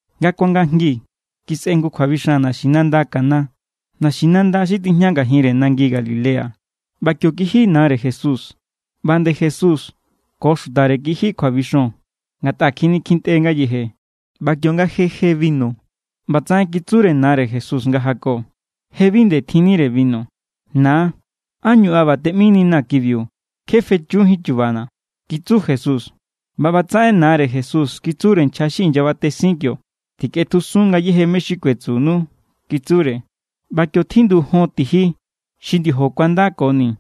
Nga kuangajngi kisꞌe jngu kjuabixan naxinanda Caná, naxinanda xi tijña ngajinre nangi Galilea, ꞌba kio kiji nare Jesús. ꞌBa nde Jesús ko xutare kiji kjuabixon, ngatꞌa kjinikintꞌe ngayeje. ꞌBa kionga je je binu, ꞌbatsaꞌen kitsure nare Jesús nga jako: —Je bi nde tjinnire binu. —Na, ¿ánñu an ꞌba teꞌmininaa̱ kibiu? Kje fechujín chubana̱ —kitsu Jesús. ꞌBa ꞌbatsaꞌen nare Jesús kitsure nchja xi inyabatesin kio: —Tikꞌetjusun ngayéje mé= xi kuetsunu —kitsure. ꞌBa kio tjindu jon tiji xi ndiojo kuandakoni.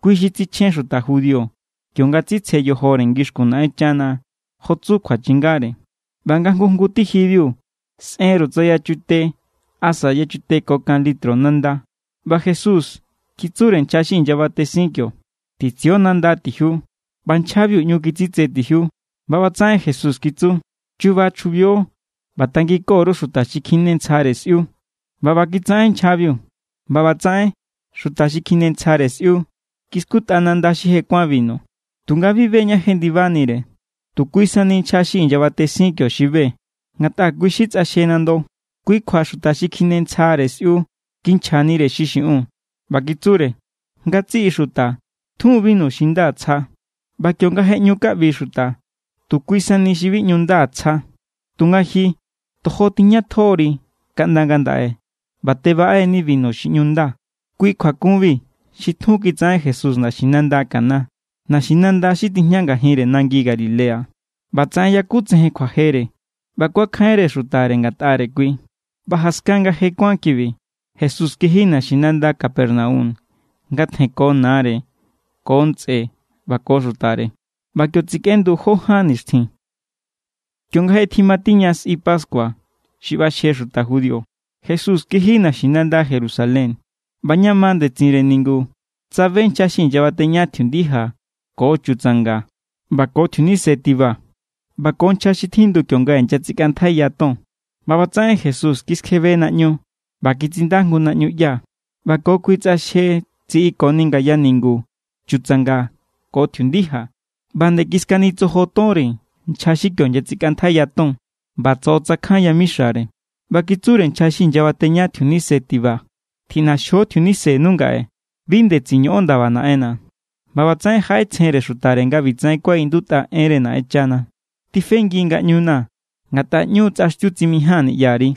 Kui xi tsichjen xuta judío kionga tsitsje yojore ngixkun Naꞌenchana, jo tsu kjuachingare. ꞌBa nga jngu jngu tijibiu sꞌenru tsa yachute asa yachute ko kan litro nanda. ꞌBa Jesús kitsure nchja xi inyabatesin kio: —Titsio nanda tijiu. ꞌBa nchjabiu ꞌñu kitsitse tijiu, ꞌba ꞌbatsaꞌen Jesús kitsu: —Chuba chjubio ꞌba tanginko_ru xuta xi kjinentsjare sꞌiu. ꞌBa ꞌba kitsaꞌen nchjabiu. ꞌBa ꞌbatsaꞌen xuta xi kjinentsjare sꞌiu kiskutꞌa nanda xi je kuán binu, tunga bi be ña jendibanire. Tu kui sani nchja xi inyabatesin kio xi be, ngatꞌa kui= xi tsꞌaxje nando. Kui kjua xuta xi kjinentsjare sꞌiu kinchjanire xi xiꞌiun. ꞌBa kitsure: —Ngatsiꞌi xuta tjun binu xi nda tsja, ꞌba kionga je ꞌñu kaꞌbi xuta, tu kui sani xi bi ꞌñu nda tsja. Tunga ji, tojo tijñatjo=ri kaꞌnda ngandaꞌe ꞌba tebaꞌe=ni binu xi ꞌñu nda. Kui kjuakunbiu xi tjun kitsaꞌen Jesús naxinanda Caná, naxinanda xi tijña ngajinre nangi Galilea. ꞌBatsaꞌen yakutsejen kjuajere, ꞌba kuakjainre xutare ngatꞌare kui. ꞌBa jaskan nga je kuán kibiu, Jesús kiji naxinanda Capernaum nga tjenko nare ko ntsꞌe ꞌba ko xutare. ꞌBa kio tsekꞌendu jó ján nixtjin. Kionga je timatiña sꞌi pascua xi ꞌbaxje xuta judío, Jesús kiji naxinanda Jerusalén. ꞌBa ña ma ndetsinre ningu tsabe nchja xi inyabateña tjiundija ko chutsanga ꞌba ko tjiunise tiba ꞌba ko nchja xi tjindu kionga inyatsikꞌantjaiya ton. ꞌBa ꞌbatsaꞌen Jesús kiskjebe naꞌñu ꞌba kitsinda jngu naꞌñuꞌya ꞌba ko kui tsꞌaxje tsiꞌikoni ngaya ningu chutsanga ko tjiundija. ꞌBa nde kiskanitsojo tonre nchja xi kio inyatsikꞌantjaiya ton ꞌba tsoꞌotsakjan yamixare. ꞌBa kitsure nchja xi inyabateña tjiunise tiba: —¡Tjiꞌnaxjio tjiunisenu ngaꞌe! ¡Bi ndetsin ñoꞌon ndaba Naꞌenna̱! ꞌBa ꞌbatsaꞌen jaꞌetsjenre xutare nga ꞌbitsaꞌen kuaꞌindutꞌa enre Naꞌenchana: “Tifengi ngaꞌñuna̱ ngatꞌa ꞌñu tsꞌaxtiu tsimijaa̱n niꞌyari.”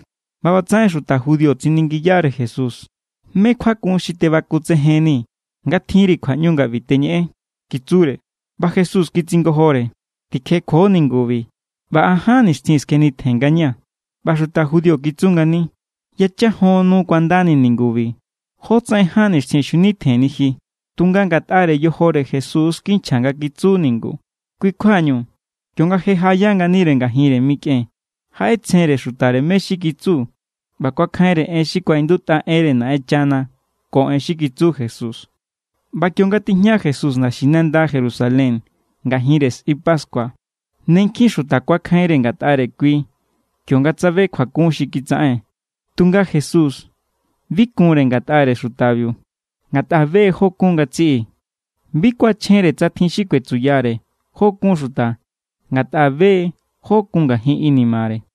ꞌBa ꞌbatsaꞌen xuta judío tsiningiyare Jesús: —¿Mé= kjuakun xi tebakutsejennii̱ nga tjinri kjuaꞌñu nga ꞌbi teñeꞌen? —kitsure. ꞌBa Jesús kitsingojore: —Tikjekjuo ningubi, ꞌba an ján nixtjin skjenitjen ngañaa̱. ꞌBa xuta judío kitsu ngani: —Yachan jon nu kuandani ningubi. ¿Jótsaꞌen ján nixtjin xjunitjenni ji? Tunga ngatꞌare yojore Jesús= kinchja nga kitsu ningu. Kui= kjuañu, kionga je jaꞌaya nganire ngajinre mikꞌen, jaꞌetsjenre xutare mé= xi kitsu ꞌba kuakjainre en xi kuaꞌindutꞌa enre Naꞌenchana ko en xi kitsu Jesús. ꞌBa kionga tijña Jesús naxinanda Jerusalén ngajinre sꞌi pascua, ne nkjin xuta kuakjainre ngatꞌare kui kionga tsabe kjuakun xi kitsaꞌen. Tunga Jesús, bi kunre ngatꞌare xutabiu, ngatꞌa be= jó kun ngatsiꞌi. Bi kuachjenre tsa tjin xi kuetsuyare jó= kun xuta, ngatꞌa be= jó kun ngajin inimare.